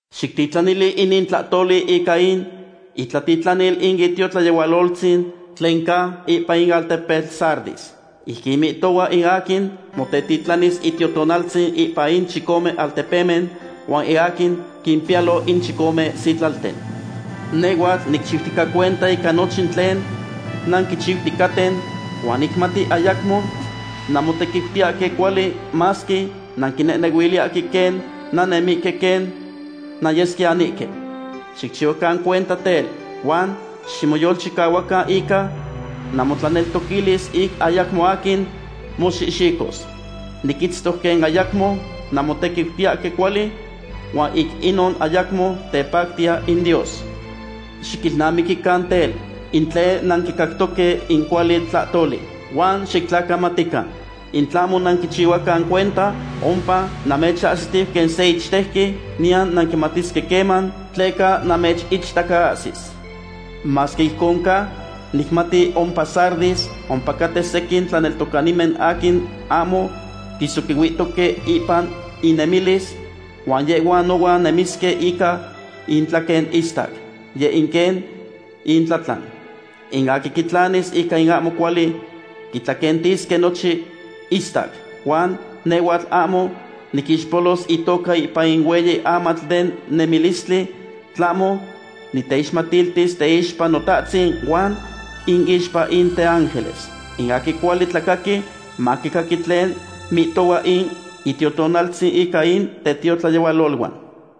’Xictitlanili inin tlahtoli ica in itlatitlanil in itiotlayehualoltzin tlen ca ipan in altepetl Sardis. Ijquin mihtohua in aquin motetitlanis Itiotonaltzin ipan in chicome altepemen huan in aquin quimpiyalo in chicome sitlalten: “Nehhuatl nicchiutica cuenta ica nochin tlen nanquichiuticaten, huan nicmati ayacmo nanmotequiutiyahque cuali masque nanquinehnehuiliyahque quen nannemihque quen nanyesquiyanihque. Xicchihuacan cuenta tel, huan ximoyolchicahuacan ica namotlaneltoquilis ic ayacmo aquin moxihxicos. Niquitztoc quen ayacmo nanmotequiutiyahque cuali, huan ic inon ayacmo tepactiya in Dios. Xiquilnamiquican tel, in tlen nanquicactoque in cuali tlahtoli, huan xictlacamatican. In tlahmo nanquichihuacan cuenta, ompa namechahsitiu quen se ichtejqui, niyan nanquimatisque queman, tleca namechichtacaahsis. Masque ijcon ca, nicmati ompa Sardis ompacaten sequin tlaneltocanimen aquin ahmo quisoquihuihtoque ipan inemilis, huan yehhuan nohuan nemisque ica intlaquen istac. Yeh in quen intlatlan. In aquin quitlanis ica in ahmo cuali quitlaquentisque nochin istac, huan nehhuatl ahmo niquixpolos itoca ipan in hueyi amatl den nemilistli, tlahmo niteixmatiltis teixpa Notahtzin huan inixpa in teángeles. In aquin cuali tlacaqui, maquicaqui tlen mihtohua in Itiotonaltzin ica in tetiotlayehualoluan.”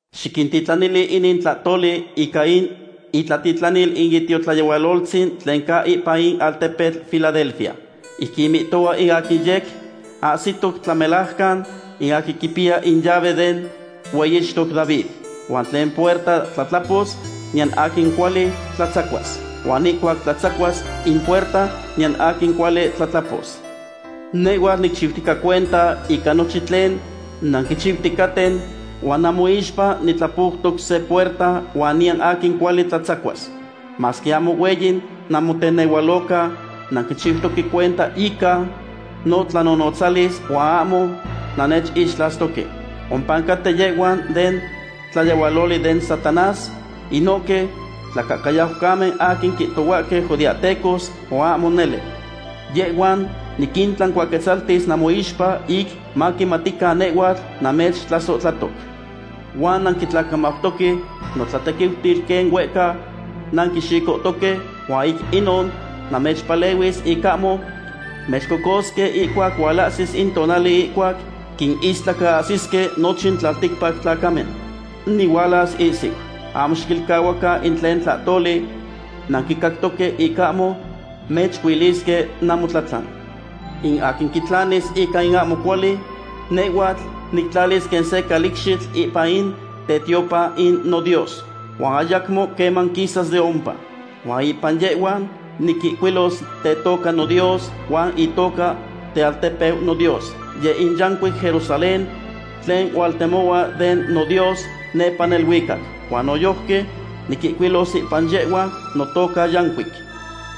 ’Xictitlanili inin tlahtoli ica in itlatitlanil in itiotlayehualoltzin tlen ca ipan in altepetl Filadelfia. Ijquin mihtohua in aquin yec ahsitoc tlamelajcan, in aquin quipiya in llave den hueyixtoc David. Huan tlen puerta tlatlapos, niyan aquin cuali tlatzacuas. Huan ihcuac tlatzacuas in puerta, niyan aquin cuali tlatlapos: “Nehhuatl nicchiutica cuenta ica nochin tlen nanquichiuticaten huan namoixpa nitlapoutoc se puerta huan niyan aquin cuali tlatzacuas. Masque ahmo hueyi namotenehualoca, nanquichiutoque cuenta ica notlanonotzalis huan ahmo nannechixtlastoque. Ompa caten yehhuan den tlayehualoli den Satanás, inohque tlacahcayaucamen aquin quihtohuahque judeahtecos, huan ahmo nele. Yehhuan niquintlancuaquetzaltis namoixpa ic maquimatican nehhuatl namechtlasohtlahtoc. Huan nanquitlacamautoque notlatequiutil quen huehca nanquixicohtoque, huan ic inon namechpalehuis ic ahmo mechcocosque ihcuac hualahsis in tonali ihcuac quinistlacaahsisque nochin tlalticpac tlacamen. Nihualas ihsiu. Ahmo xiquilcahuacan in tlen tlahtoli nanquicactoque ic ahmo mechcuilisque namotlatlan. In aquin quitlanis ica in ahmo cuali, nehhuatl nictlalis quen se calicxitl ipan in tetiopan in noDios, huan ayacmo queman quisas de ompa. Huan ipan yehhua niquihcuilos tetoca noDios huan itoca tealtepeu noDios, yeh in yancuic Jerusalén tlen hualtemohua den noDios nepa neluicac. Huan noyojqui niquihcuilos ipan yehhua notoca yancuic.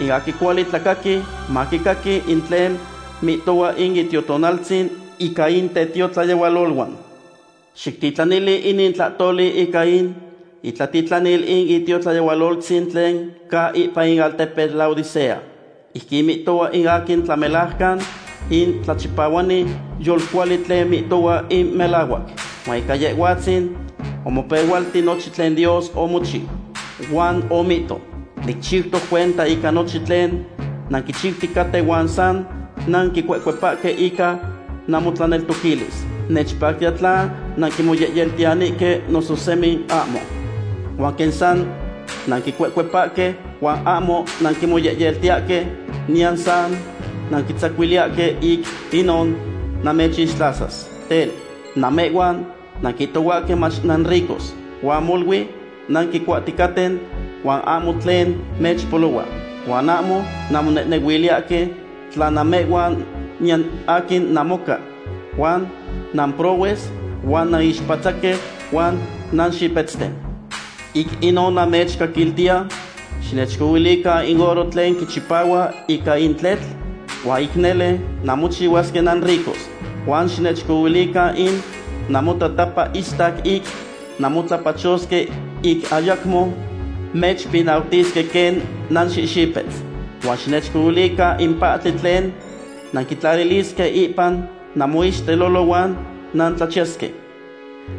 In aquin cuali tlacaqui, maquicaqui in tlen mihtohua in Itiotonaltzin ica in tetiotlayehualoluan.” ’Xictitlanili inin tlahtoli ica in itlatitlanil in itiotlayehualoltzin tlen ca ipan in altepetl Laodicea. Ijquin mihtohua in aquin tlamelajcan, in tlachipahuani yolcuali tlen mihtohua in melahuac. Huan ica Yehhuatzin omopehualti nochin tlen Dios omochiu. Huan omihto: “Nicchiutica cuenta ica nochin tlen nanquichiuticaten huan san nanquicuecuepahque ica namotlaneltoquilis. Nechpactiya tla nanquimoyehyeltiyahque noso semi ahmo. Huan quen san nanquicuecuepahque, huan ahmo nanquimoyehyeltiyahque niyan san nanquitlatzihuiliyahque, ic inon namechixtlasas. Tel, namehhuan nanquihtohuahque mach nanricos, huan molui nanquicuahticaten, huan ahmo tlen mechpolohua. Huan ahmo nanmonehnehuiliyahque tla namehhuan niyan aquin namoca, huan namprohues, huan nanixpatzaque huan nanxipetzten. Ic inon namechcaquiltiya xinechcohuilican in oro tlen quichipahua ica in tletl, huan ic nele nanmochihuasque nanricos. Huan xinechcohuilican in namotatapa istac ic nanmotlapachosque ic ayacmo mechpinautisque quen nanxihxipetz. Huan xinechcohuilican in pahtli tlen nanquitlalilisque ipan namoixtelolo huan nantlachiyasque.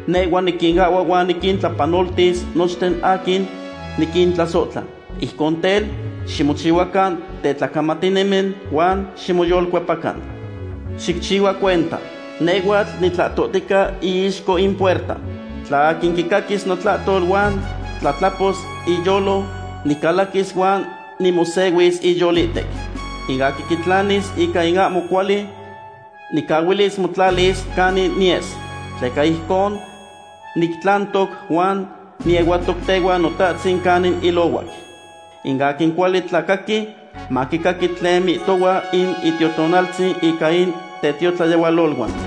Nehhua niquinahhua huan niquintlapanoltis nochten aquin niquintlasohtla. Ijcon tel, ximochihuacan tetlacamatinimen huan ximoyolcuepacan. ¡Xicchihua cuenta! Nehhuatl nitlahtohtica iixco in puerta. Tla aquin quicaquis notlahtol huan tlatlapos iyolo, nicalaquis huan nimosehuis iyolihtec. In aquin quitlanis ica in ahmo cuali nicahuilis motlalis canin niyes. Tleca ijcon nictlantoc, huan niehuatoc tehuan Notahtzin canin ilohuac. In aquin cuali tlacaqui, maquicaqui tlen mihtohua in Itiotonaltzin ica in tetiotlayehualoluan.”